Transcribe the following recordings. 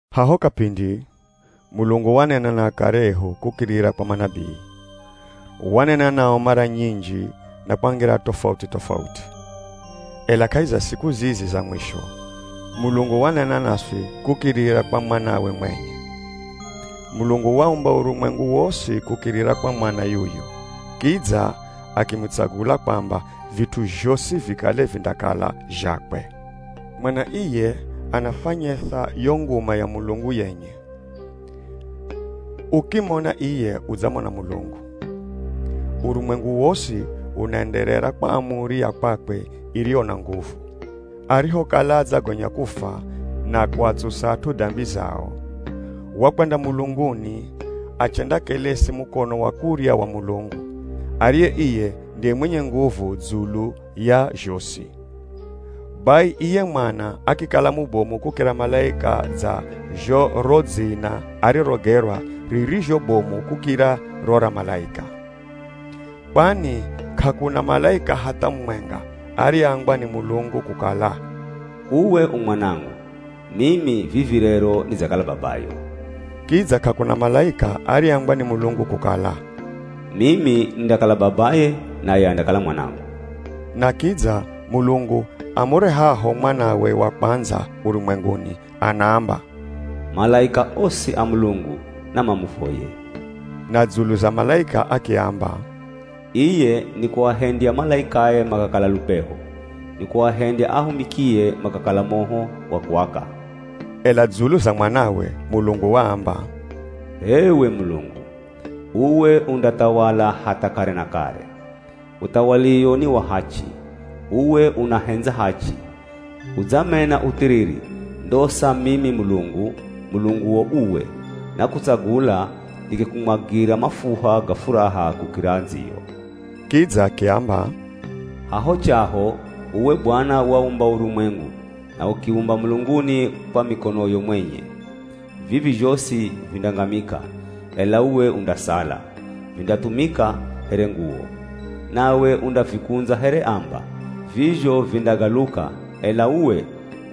Haho kapindi, Mulungu wanena na akare ehu kukirira kwa manabii. Wanena nao mara nyinji na kwa ngira tofauti-tofauti. Ela kahi za siku zizi za mwisho, Mulungu wanena naswi kukirira kwa Mwanawe mwenye. Mulungu waumba urumwengu wosi kukirira kwa Mwana yuyu, kidza akimutsagula kwamba vit'u zhosi vikale vindakala zhakwe. Mwana iye anafwanyesa yo nguma ya Mulungu yenye. Ukimona iye udzamona Mulungu. Urumwengu wosi unaenderera kwa amuri ya kwakwe iriyo na nguvu. Arihokala adzagonya kufwa na kuatsusa at'u dambi zao, wakwenda mulunguni achendakelesi mukono wa kurya wa Mulungu, ariye iye ndiye mwenye nguvu dzulu ya zhosi. Bai iye Mwana akikala mubomu kukira malaika dza zho ro dzina arirogerwa ririzho bomu kukira ro ra malaika. Kwani k'akuna malaika hatha mumwenga ariyeambwa ni Mulungu kukala, “Uwe u Mwanangu; mimi vivi rero nidzakala Babayo.” Kidza k'akuna malaika ariyeambwa ni Mulungu kukala, “Mimi nindakala Babaye, Naye andakala Mwanangu.” Na kidza, Mulungu amurehaho Mwanawe wa kwandza urumwenguni, anaamba, “Malaika osi a Mulungu namamuvoye.” Na dzulu za malaika akiamba, “Iye nikuahendya malaikae makakala lupeho, nikuahendya ahumikie makakala moho wa kuaka.” Ela dzulu za Mwanawe, Mulungu waamba, “H'ewe Mulungu, uwe undathawala hatha kare na kare, Uthawaliwo ni wa hachi. Uwe unahendza hachi, udzamena uthiriri. Ndosa mimi Mulungu, Mulunguo uwe, nakutsagula nikikumwagira mafuha ga furaha kukira andziyo.” Kidza akiamba, “Haho chaho, uwe Bwana waumba urumwengu na ukiumba mulunguni kwa mikonoyo mwenye. Vivi zhosi vindangamika, ela uwe undasala; vindathumika here nguwo. Nawe undavikundza here amba. Vizho vindagaluka, ela uwe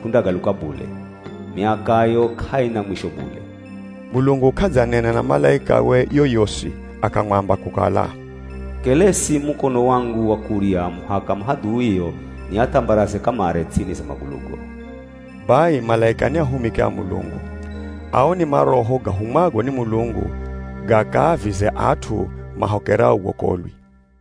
k'undagaluka bule. Miakayo k'aina mwisho bule.” Mulungu k'adzanena na malaikawe yoyosi akamwamba kukala, “Kelesi mukono wangu wa kurya muhaka mahadhuio niathambaraze kamare ts'ini za magulugo.” Bai malaika ni ahumiki a Mulungu. Ao ni maroho gahumwago ni Mulungu gakaavize at'u mahokerao wokolwi.